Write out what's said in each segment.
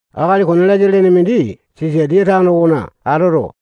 Akali Koniliasa lene mindi Sisatiya tano okona atoto,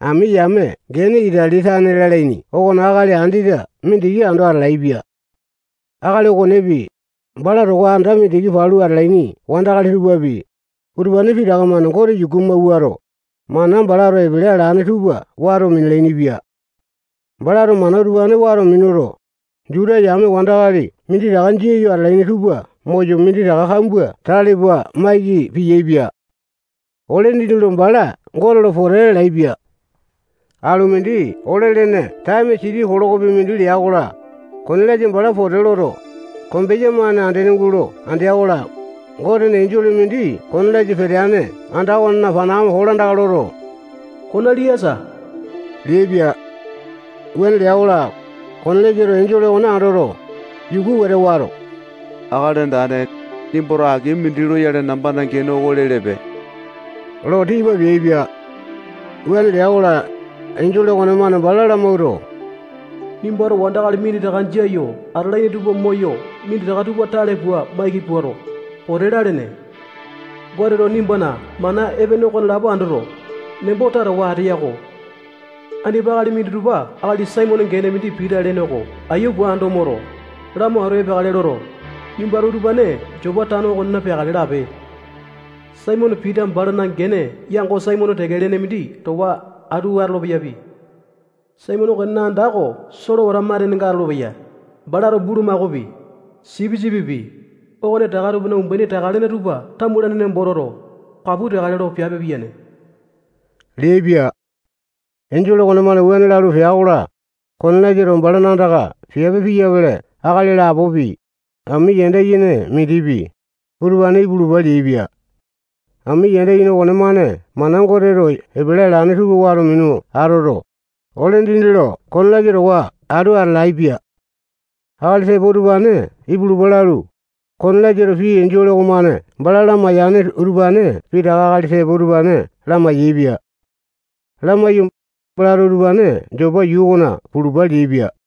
ami yame gene Itali tane lalaini okona akali andete mindiki ando atalaepia. Akali okonepi, bala towa anda mindikina palu atalaini wandakali tupapi, utupane pitaka-mane Gote yuku amawuato, mana balato epele alane tupa wato minalaini-pia. Balato mana utupane wato minuto, Juta yame wandakali minditaka jia yo atalaini tupa moyo minditaka kambua tale pua maiki piyaepia. Ole dindi lo bala Gote lo pote lalaepia. Alu mindi ole lene taeme siti kilokopi mindi lea-kola, Koniliasa bala pote loto, kombeya-mane andene gulo andea-kola, Gotena enjole mindi Koniliasa peteane anda okonena panakame kolandaka loto, Koniliasa leaipia. Wuane lea-kola, Koniliasato enjole okone andoto, yuku wete wato, Akali Andane, nimbato aki mindi loyale nambana gene oko lelepe lo tipa peaipia. Wuane lea-kola, enjole okonemane bala lamawuato, nimbato wandakali minditaka jia yo atalaini tupa moyo minditaka tupa tale pua maiki puato, pote lalene. Goteto nimbana mana epene okonelapo andoto, nembo tatawa ateya-ko. Andipa akali minditupa akali Saimone gene mindi Pita lene oko aiya pua ando moto, lamo atu epeakale loto, nimbato utupane Jopa tano okona peakale lape. Saimone Pita balana gene yango Saimone teke lene mindi towa atu atolo-peyapi. Saimone okonena anda oko solewata matenenga atolopeya. Balato bulumakaopi, sipisipipi, okone taka tupana umbaini taka-lene tupa tamulaini nembo toto, kapu teakale lo piape piyane leaipia. Enjole okonemane wuane lalu pea-kola, Koniliasato balana andaka piape piyapele akali lapopi, ami yanda yene mindipi, utupane ipulupa leaipia. Ami yanda yene okonemane mana Goteto epele alane tupa wato minu atoto, ole dindi lo Koniliasa towa atu atalaepia. Akali tepo utupane ipulupa lalu, Koniliasato pii enjole okomane bala lamaiyane utupane pitaka akali tepo utupane lamai-yaepia. Lamaiyu, balato utupane Jopa yuu okona pulupa leaipia.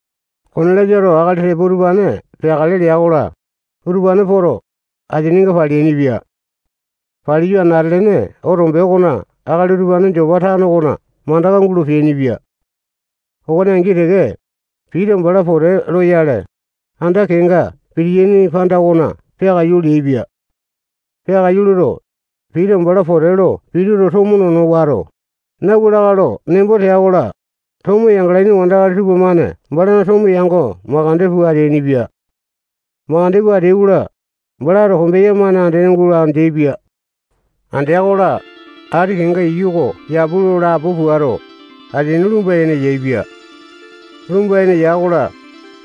Koniliasato akali tepo utupane peakale lea-kola, utupane poto, asininga paleainipia. Paliyu, anate-lene otombe okona akali utupane Jopa tano okona mandaka gulo peainipia. Okone angi teke, Pita bala pote loyale, anda kenga pitiyaini panda okona peakaiyu leaipia. Peakaiyu loto, Pita bala pote lo pituto, tomo nono wato, nauwa lakae lo nembo tea-kola, tomo yangalaini wandakali tupamane balana tomo yango makande pua ateainipia. Makande pua ateai-kola, balato kombeya-mane andene gulo andeaipia. Andea-kola, ati kenga iyu oko yapu lo lapo puato, asini lumba-yene yaepia. Lumba-yene ya-kola,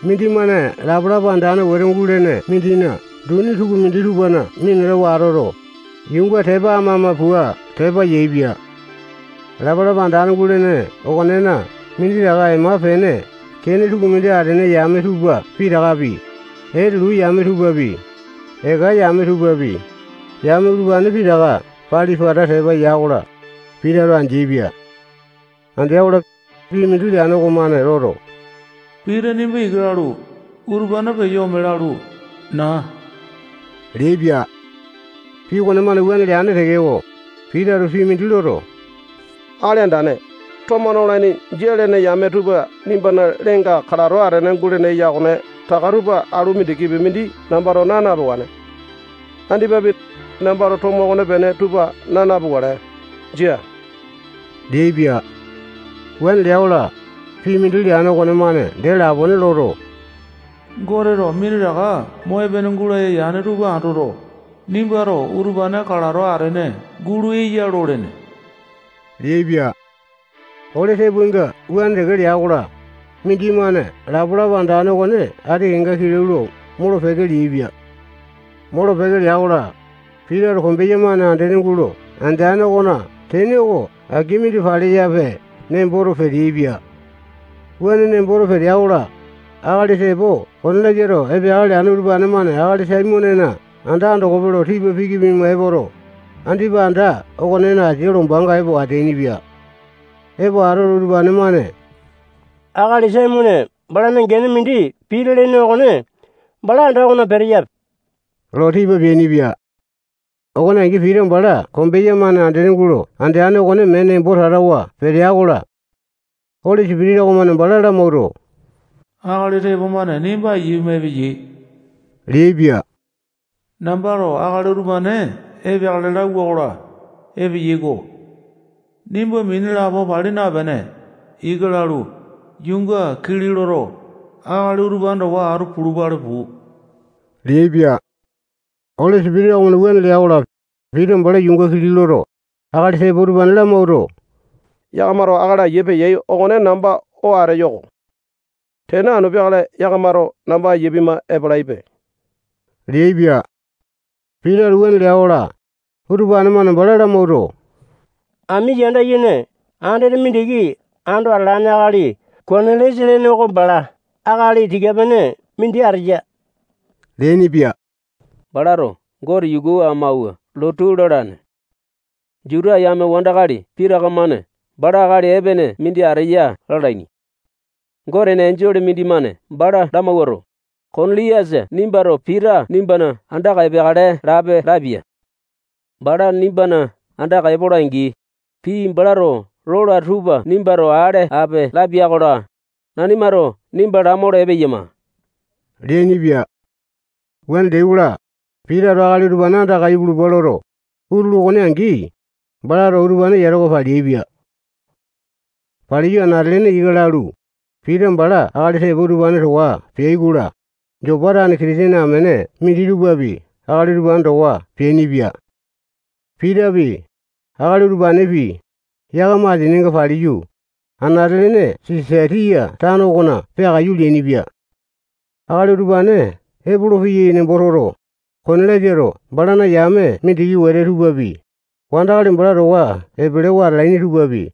mindimane lapalapa andane wete gulene mindina duni tukumindi tupana minatawa atoto, yuunga tepa ama-ama pua tepa yaepia. Lapalapa andane gulene okonena minditaka ema-pene kene tukumindi atene yame tupa pitakapi, etelu yame tupapi, eka yame tupapi, yame utupane pitaka pali-pata tepa ya-kola, Pitato andeaipia. Andea-kola, pii mindi leane okomane loto, Pita nimba ika lalu, utupane peyo ome lalu, naa leaipia. Pii okonemane wuane leane tekeko, Pitato pii mindi loto, Akali Andane, tomo nolaini jia lene yame tupa nimbana leenga kalato atene gulene eya okone taka tupa alu mindikipi mindi nambato naa napewane. Andipapi, nambato tomo okonepene tupa naa napukale. Jia leaipia. Wuane lea-kola, pii mindi leane okonemane dee lapone loto, Goteto minditaka mo epene gulaya yane tupa ando, nimbato utupane kalato atene gulo eya lolene leaipia. Ole tepoainga wuane teke lea-kola, mindimane lapalapa andane okone ati kenga kilau lo molo-peke leaipia. Molo-peke lea-kola, Pitato kombeya-mane andene gulo andeane okona tene oko aki mindi paleyape nemboto peteaipia. Wuane nemboto petea-kola, akali tepo Koniliasato epeakale leane utupane-mane akali Saimonena anda andokope lo tipa piki pua epoto, andipa anda okonena asia lombanga epo ateainipia. Epo atoto, utupane-mane akali Saimone balana gene mindi Pita lene okone bala anda okona peteyape lo tipa peainipia. Okone angi, Pita bala kombeya-mane andene gulo andeane okone mee nembo tatawa petea-kola, Oli Sipitisa okomane bala lamawuato, akali tepo-mane nimba aiya pima epeyai leaipia. Nambato akali utupane epeakale lauwa-kola, epeyai-ko. Nimba mini lapo pali napene, ika lalu, yuunga kili loto, akali utupane towa atu pulupale puu leaipia. Oli Sipitisa okomane wuane lea-kola, Pita bala yuunga kili loto, akali tepo utupane lamawuato, yakamato akali aiya peyai okone namba oo ateyo oko. Tene anu peakale yakamato namba aiya pima epalaipe leaipia. Pitato wuane lea-kola, utupane-mane bala lamawuato, ami yanda yene andete mindiki ando atalane akali Koniliasa lene oko bala akali tika-pene mindi ateya leainipia. Balato Gote yuku amawua lotu lalane. Juta yame wandakali pitaka-mane bala akali epene mindi ateya lalaini. Gotena enjole mindimane bala lamawuato, Koniliasa nimbato Pita nimbana andaka epeakale lape lapia. Bala nimbana andaka epola-angi, pii balato lola tupa nimbato ale ape lapia-kola, nanimato nimba lamolo epeyama leainipia. Wuane leai-kola, Pitato akali utupane andaka ipulupa loto, utulu okone angi, balato utupane yatawa paleaipia. Paliyu, anate-lene ika lalu, Pita bala akali tepo utupane towa peai-kola, Jopa tane Kitisene amene minditupapi akali utupane towa peainipia. Pitapi, akali utupanepi, yakama asininga paliyu, anate-lene Sisatiya tano okona peakaiyu leainipia. Akali utupane epolopeyai nembo toto, Koniliasato balana yame mindiki wete tupapi, wandakali bala towa epelewa atalaini tupapi,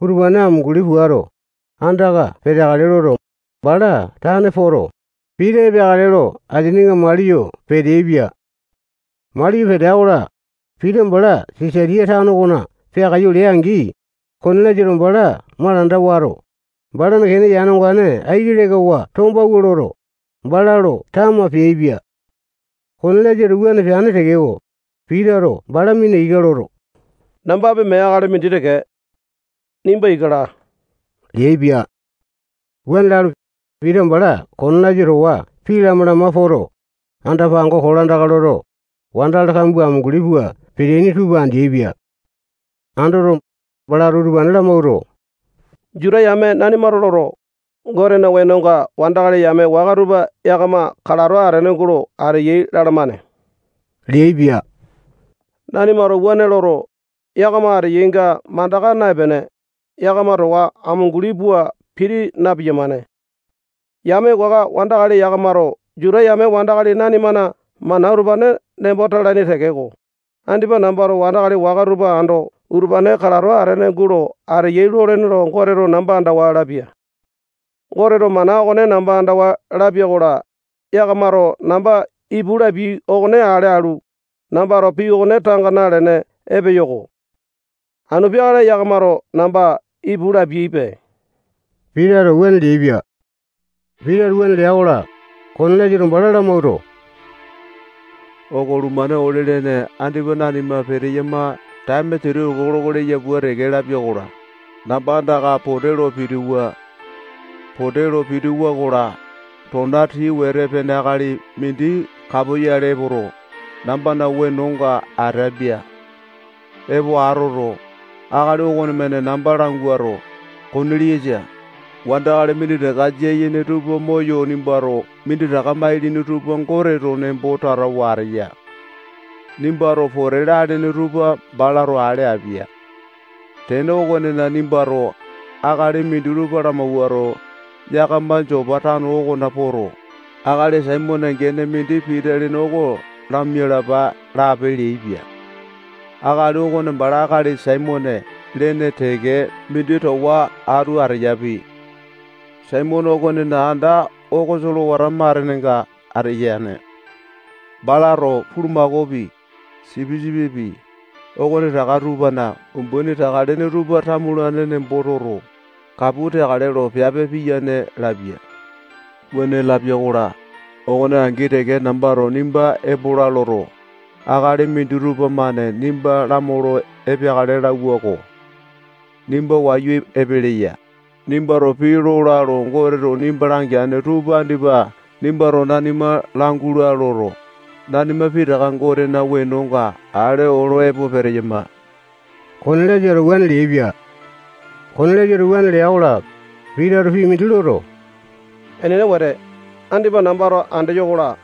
utupane amunguli puato, andaka peteakale loto, bala tane poto, Pita epeakale lo asininga mali yo peteaipia. Mali yo petea-kola, Pita bala Sisaliya tano okona peakaiyu lea-angi, Koniliasato bala malanda wato, balana kene yane ongane aiki lekawa tombawua loto, bala lo tama peaipia. Koniliasato wuane peane tekeko, Pitato bala mina ika loto, nambapi mee akali mindi teke. Nimba ika laa leaipia. Wuane lalu, Pita bala Koniliasa towa pii lama-lama poto, anda-pango kolandaka loto, wandakali kambua amunguli pua peteaini tupa andeaipia. Andoto, balato utupane lamawuato, Juta yame nanimato loto, Gotena wenonga wandakali yame waka tupa yakama kalato atene gulo ateyai lalamane leaipia. Nanimato wuane loto, yakama ateyainga mandaka naepene, yakama towa amunguli pua piti na-piyamane. Yame waka wandakali yakamato Juta yame wandakali nanimana mana utupane nembo talaini tekeko, andipa nambato wandakali waka tupa ando utupane kalato atene gulo ateyai lolene lo Goteto namba andawa lapia. Goteto mana okone namba andawa lapia-kola, yakamato namba ipu lapiai okone ale alu, nambato pii okone tanga nalene epeyo-ko. Anu peakale yakamato namba ipu lapiaipe. Pitato wuane leaipia. Pitato wuane lea-kola, Koniliasato bala lamawuato, okolumane ole-lene andipa nanima peteyama taeme siti kiloko leya pua teke lapia-kola, namba andaka pote lo pitiwa. Pote lo pitiwa-kola, tona tii wete pene akali mindi kapoyale epoto, nambana wenonga atapia. Epo atoto, akali okonemane namba languato, Koniliasa, wandakali minditaka jia yene tupa moyo nimbato minditaka mailini tupa Goteto nembo tatawa ateya. Nimbato pote lalene tupa balato ale apia. Tene okonena, nimbato akali minditupa lamawuato, yakama Jopa tano okona poto, akali Saimone gene mindi Pita lene oko lamialapa lape leaipia. Akali okone bala akali Saimone lene teke mindi towa atu ateyapi. Saimone okonena anda oko solewata matenenga ateyane. Balato bulumakaopi, sipisipipi, okonetaka tupana umbaini taka-lene tupa tamulaini nembo toto, kapu teakale lo piape piyane lapia. Wuane lapia-kola, okone angi teke nambato nimba epola loto, akali minditupa-mane nimba lamolo epeakale lauwa-ko. Nimba wayu epeleya. Nimbato pii lola lo Goteto nimba langeane tupa andipa nimbato nanima langula loto, nanima pitaka Gotena wenonga ale olo epo peteyama. Koniliasato wuane leaipia. Koniliasato wuane lea-kola, Pitato pii mindi loto, enene wete, andipa nambato andeyo-kola,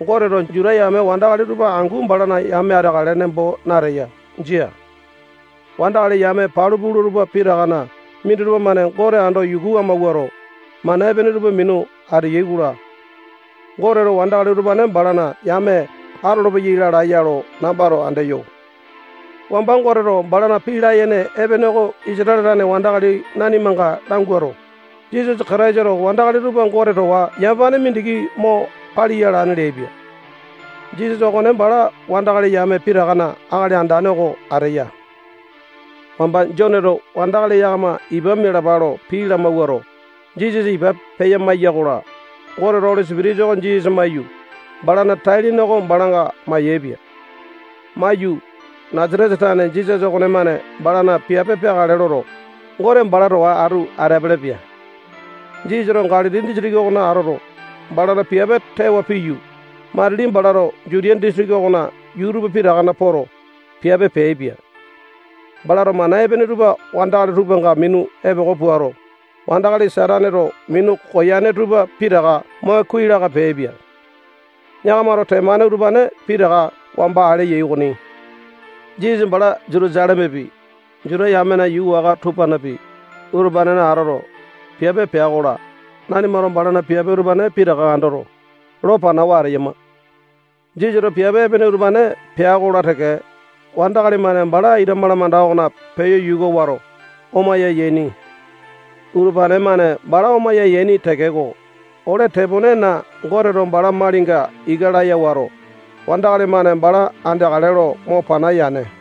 Goteto Juta yame wandakali tupa angu balana yame ateakale nembo nateya. Jia. Wandakali yame palu pula tupa pitakana minditupa-mane Gote ando yuku amawuato, mana epene tupa minu ateyai-kola, Goteto wandakali utupane balana yame atolopeyai lalae-ya lo nambato andeyo. Wamba Goteto balana pii layene epene oko Isatale tane wandakali nanimanga languato, Jisasa Kataisato wandakali tupa Gote towa yamapane mindiki mo paliya alane leaipia. Jisasa okone bala wandakali yame pitakana Akali Andane oko ateya. Wamba Joneto wandakali yakama ipa mialapa lo pii lamawuato, Jisasa ipa peya maiya-kola, Goteto Oli Sipitisa oko Jisasa maiyu, balana tai-lene oko balanga mayaepia. Maiyu, Nasatesa tane Jisasa okonemane balana piape peakale loto, Goteto bala towa atu ateapele-pia. Jisasato Galili disitiki okona atoto, balana piape tewa piyu, matili balato Jutiya disitiki okona yuu tupa pitakana poto, piape peaipia. Balato mana epene tupa wandakali tupanga minu epoko puato, wandakali Sataneto minu koyane tupa pitaka mo kuai laka peaipia. Yakamato temane utupane pitaka wamba ale yai okoni. Jisasa bala Jutusalemepi, Juta yamena yuu waka tupanapi, utupanena atoto, piape pea-kola, nanimato balana piape utupane pitaka andoto, lo panawa ateyama. Jisasato piape epene utupane pea-kola teke, wandakali-mane bala ita malamanda okona peyo yuka wato, omaya yaini. Utupane-mane bala omaya yaini tekeko, ole teponena Goteto bala malinga ika laya wato, wandakali-mane bala andeakale lo mo pana yane.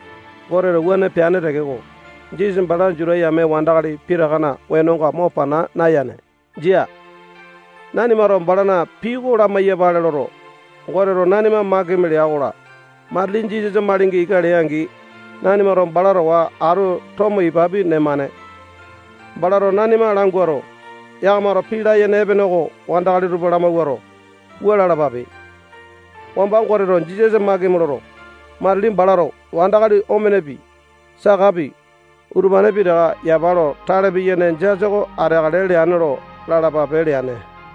Goteto wuane peane tekeko, balato Jisasa bala Juta yame wandakali pitakana wenonga mo pana nayane. Jia. Nanimato balana pii oko lamai-yapale loto, Goteto nanima makimi lea-kola, matili Jisasa malinga ika lea-angi, nanimato bala towa atu tomo ipapi nemane. Balato nanima languato, yakamato pii layene epene oko wandakali tupa lamawuato, wua lalapape: Wamba Goteto Jisasa makimi loto, matili balato wandakali omenepi, sakapi, utupane pitaka yapa lo tale piyane jasa oko ateakale leane lo lalapape leane.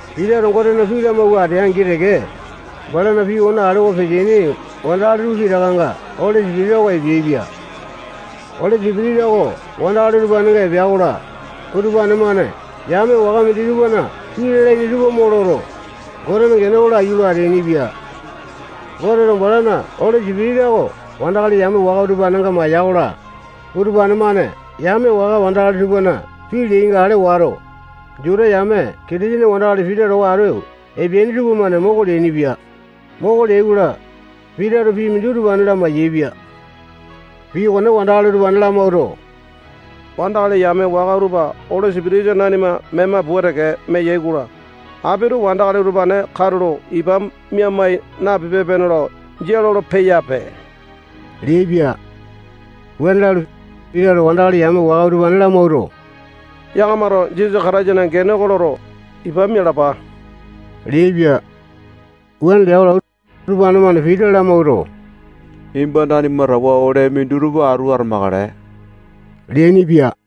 Pitato Gotena pii lamawua atea-angi teke, balana pii okone alewa peteaini wandakali tupa pitakanga Oli Sipitisa oko epeaipia. Oli Sipitisa oko wandakali utupanenga epea-kola, utupane-mane yame waka minditupana pii lalaini tupa mo loto, Gotena gene oko laiyu lo ateainipia. Goteto balana Oli Sipitisa oko wandakali yame waka utupanenga maiya-kola, utupane-mane yame waka wandakali tupana pii leyainga andoto, Juta yame Kitisene wandakali Pita towa atu epeaini tupamane moko leainipia. Moko leai-kola, Pitato pii mindi utupane lamai-yaepia. Pii okone wandakali utupane lamawuato, wandakali yame waka utupa Oli Sipitisa nanima mema pua teke meyai-kola, apito wandakali utupane katulo ipa mia-mai napipe-pene lo jia lolo-peyape leaipia. Wuane lalu, Pitato wandakali yame waka utupane lamawuato, yakamato Jisasa Kataisana gene oko loto, ipa mialapa leaipia. Wuane lea-kola, utupane-mane Pita lamawuato, nimba nanima towa ole minditupa atu atamakale leainipia.